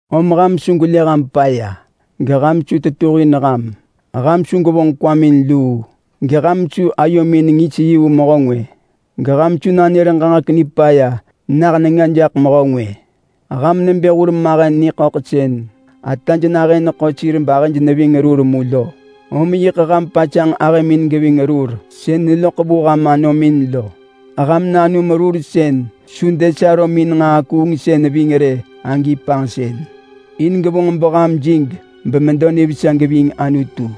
Om ham su gwelë ham paya, geham su tetuhin ham. Ham su gwevonġ kwamin luu, geham su ayomin ngis yi vu mehö ngwë, geham su nanër ġaġek nipaya nah nenga jaḳ mehö ngwë. Ham nebë hurmahen niḳöḳ sën ataj nahën neḳo sir bahëj neving rur mu lo. Om yiḳ ham pasanġ ahëmin geving rur sën neloḳ vu ham anomin lo. Ham nanum rur sën su desarömin nġaa kuungsën ving rë agi panġsën, in gevonġ beham jig bemedo nivesa geving Anutu.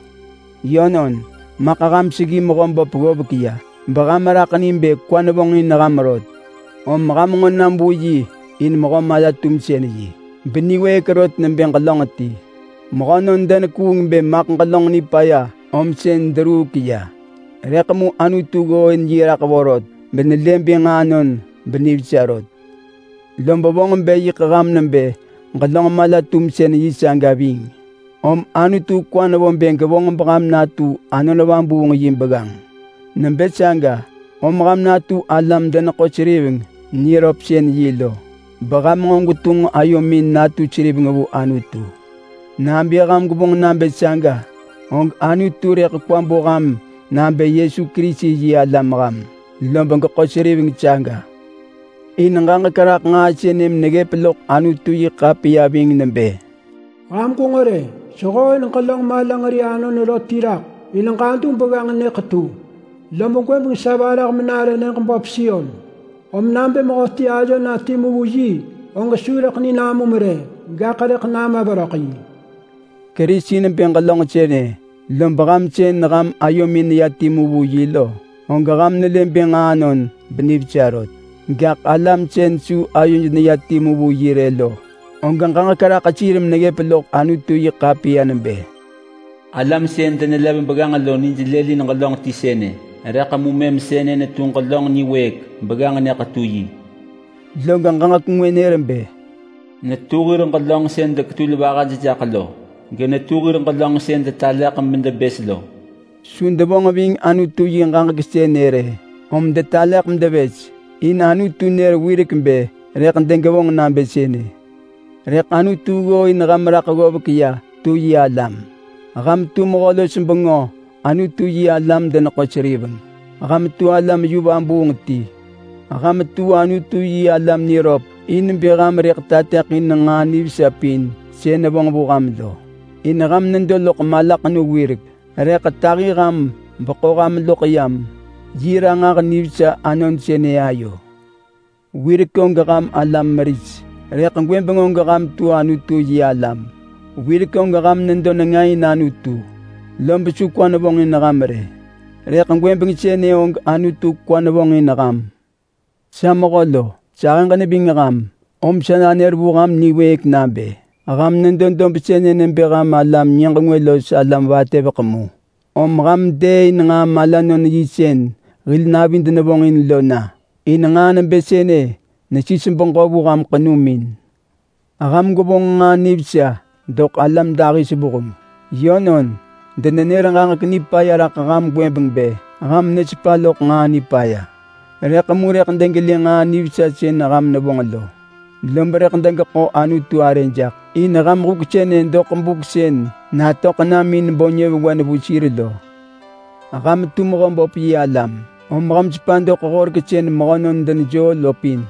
Yönon, maḳ ham seggi Mehöböp ggovek ya beham raḳ ni bë kwa nevonġin ham rot. Om ham nġo nam vu yi in mehö mala-tumsën-yi, beniwëëk rot nebë ġelönġ ti. Mehönon denekuung bë maḳ ġelönġ nipaya om sën deruuk ya. Rëḳ mu Anutu ggooin yi raḳ vorot benelë bë nġaanon benivesa rot. Lob vonġ bë yiḳ ham nebë ġelönġ mala-tumsën-yi saga ving, om Anutu kwa nevo bë gevonġ beham natu Anon Vabuung yi begganġ. Nebë saga om ham natu alam-deneḳo-seriveng niröpsën-yi lo, beham nġo gwetunġ ayomin natu seriveng vu Anutu. Nabë ham gwevonġ nabë saga, og Anutu rëḳ kwa bo ham nabë Yesu Kerisi yi alam ham, lob geḳo seriveng saga. In ġaġek raḳ nġaa sënë meneggëp loḳ Anutu-yi-ḳapiya ving nebë: “Ham gwenġo rë! Sehooin ġelönġ malanġeri anon rot ti raḳ in ġadu begganġ nyë ḳetu, lob gwëbeng sa varah menare nyëġ böp Sion. Om nabë mehöti ayo na timu vu yi, og su rëḳ ni namum rë, gaḳ rëḳ nama veröḳ yi.” Kerisi nebë ġelönġ sënë lob ham sën ham ayomin neya timu vu yi lo, og ham nelë bë nġaanon benivesa rot. Gaḳ alam sën su ayoj neya timu vu yi rë lo, og ġaġek raḳ sir meneggëp loḳ Anutu-yi-ḳapiya nebë: “Alam sën denelev begganġ lo nij lëlin ġelönġ ti sënë, rëḳ mu mëm sënë netu ġelönġ niwëëk begganġ nyë ḳetu yi.” Log ġaġek ngwë nër bë: “Netu hir ġelönġ sën deketul vahaj jaḳ lo. Genetu hir ġelönġ sën detaleḳ medebës lo.” Su devonġ ving Anutu yi ġaġek sënë rë, om detaleḳ medevës, in Anutu nër wirek bë rëḳ degevonġ nabë sënë. Rëḳ Anutu ggooin ham raḳ ggovek ya tu yi alam. Ham tu Mehö-los-bengö Anutu yi alam-deneḳo-seriveng. Ham tu alam yu vabuung ti. Ham tu Anutu-yi-alam niröp in bë ham rëḳ tateḳin nġaa nivesa pin sën nevonġ vu ham lo. In ham nedo loḳ malaḳenu wirek, rëḳ tahi ham beḳo ham loḳ yam yi ranġah nivesa anon sënë ayo. Wirek og ham alam meris, rëḳ gwëbeng og ham tu Anutu-yi-alam. Wirek og ham nedo nenga in Anutu lob su kwa nevonġin ham rë, rëḳ gwëbeng sënë og Anutu kwa nevonġin ham. Sa mehö lo, sahëġ neving ham, om sa nanër vu ham niwëëk nabë: Ham nedo dob sënë nebë ham alam-nyëġ-ngwë los alam vatëveḳ mu. Om ham dëëin nġaa malanon-yi sën hil navid nevonġin lo na. In nġaa nebë sënë nesis beġö vu ham ḳenumin. Ham gwevonġ nġaa nivesa doḳ alam dahis vuheng. Yönon, denenër ġaġek nipaya raḳ ham gwëbeng bë ham nesepa loḳ nġaa nipaya. Rëḳ mu rëḳ degelë nġaa nivesa sën ham nevonġ lo, lob rëḳ degeḳo Anutu arë jaḳ in ham huk sënë doḳ buk sën natöḳ nam in bo nyëvewen vu sir lo. Ham tu Mehöböp yi alam om ham sepa doḳ horek sën mehönon denejoo lo pin.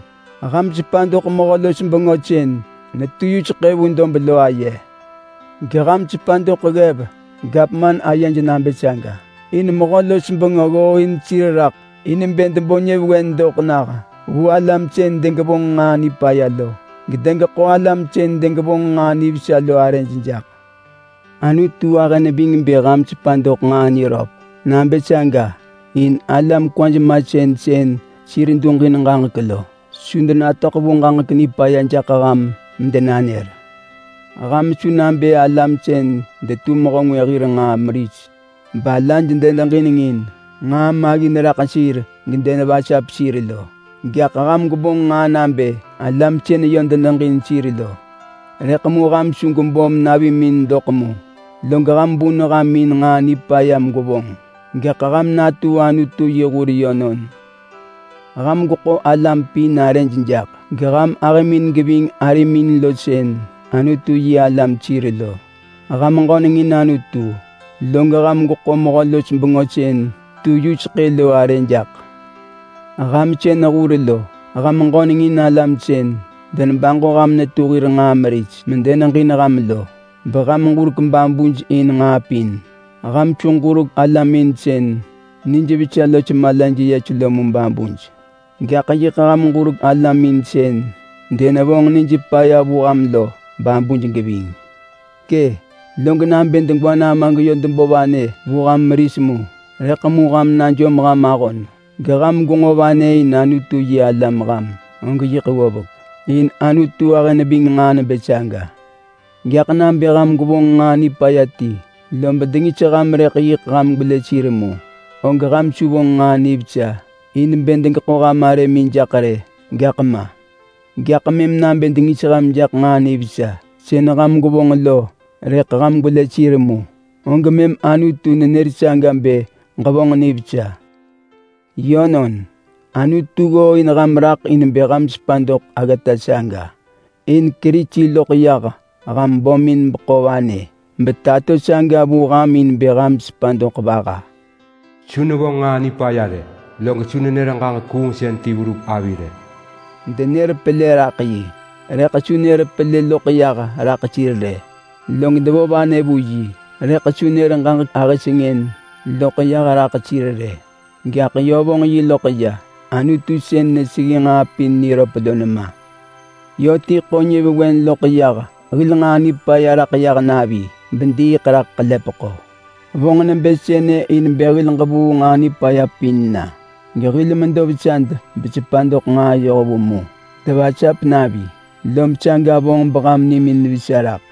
Ham sepa doḳ mehö-los-bengö sën netu yuseḳë vu dob lo aye. Geham sepa doḳ ggev gavman ayej nabë saga. In mehö-los-bengö ggooin sir raḳ in bë debo nyëvewen doḳ nah vu alam sën degevonġ nġaa nipaya lo, gedegeḳo alam sën degevonġ nġaa nivesa lo arëj jaḳ. Anutu ahë neving bë ham sepa doḳ nġaa niröp nabë saga in alam kwaj masën sën sir duġin ġaġek lo, su denatöḳ vu ġaġek nipaya jaḳ ham medenanër. Ham su nabë alam sën detu mehö ngwë hir nġaa meris balaj denedeġinengin nġaa maggin raḳ sir gedenevasap sir lo, gaḳ ham gwevonġ nġaa nabë alam sën yö deneġin sir lo. Rëḳ mu ham su gwebom navimin doḳ mu log ham bun ham in nġaa nipaya megwevonġ, gaḳ ham natu Anutu yi hur yönon. Ham gweḳo alam pin arëj jaḳ, geham ahëmin geving arimin lo sën Anutu-yi-alam sir lo. Ham ġöneng in Anutu, log ham gweḳo mehö-los-bengö sën tu yuseḳë lo arë jaḳ. Ham sën hur lo, ham ġöneng in alam sën denebaġo ham netu hir nġaa meris medeneġin ham lo, beham ġurek babuj in nġaa pin. Ham su ġurek alamin sën nijvesa los malaj yes lo mu babuj. Gaḳ yiḳ ham ġurek alamin sën denevonġ nij paya vu ham lo babuj geving. Kë! Log nabë degwa nama geyö debo vanë vu ham meris mu rëḳ mu ham najom ham ahon geham gwenġo vanë in Anutu-yi-alam ham, og yiḳ ggovek. In Anutu ahë neving nġaa nebë saga. Gaḳ nabë ham gwevonġ nġaa nipaya ti lob dengis ham rëḳ yiḳ ham gwelë sir mu, og ham su vonġ nġaa nivesa in bë degeḳo ham arëmin jaḳ rë, gaḳ ma. Gaḳ mëm nabë dengis ham jaḳ nġaa nivesa sën ham gwevonġ lo rëḳ ham gwelë sir mu, og mëm Anutu nenër saga bë ġevonġ nivesa. Yönon, Anutu ggooin ham raḳ in bë ham sepa doḳ aggata saga. In Kerisi loḳ yah ham bömin beḳo vanë betato saga vu ham in bë ham sepa doḳ vaha. “Su nevonġ nġaa nipaya rë, log su nenër ġaġek kuungsën ti verup avi rë.” Denër pelë raḳ yi, rëḳ su nër pelë loḳ yah raḳ sir rë. Log devo vanë vu yi, rëḳ su nër ġaġek ahë sengën loḳ yah raḳ sir rë. Gaḳ yö vonġ yi loḳ ya Anutu sën neseggi nġaa pin niröp lo nema. Yö ti ḳo nyëvewen loḳ yah hil nġaa nipaya raḳ yah navi bediiḳ raḳ ḳelepeḳo. Vonġ nebë sënë in bë hil ġevuu nġaa nipaya pin na, gehil medo vesad besepa doḳ nġaa yohvu mu. Devasap navi lob saga vonġ beham nimin vesa raḳ.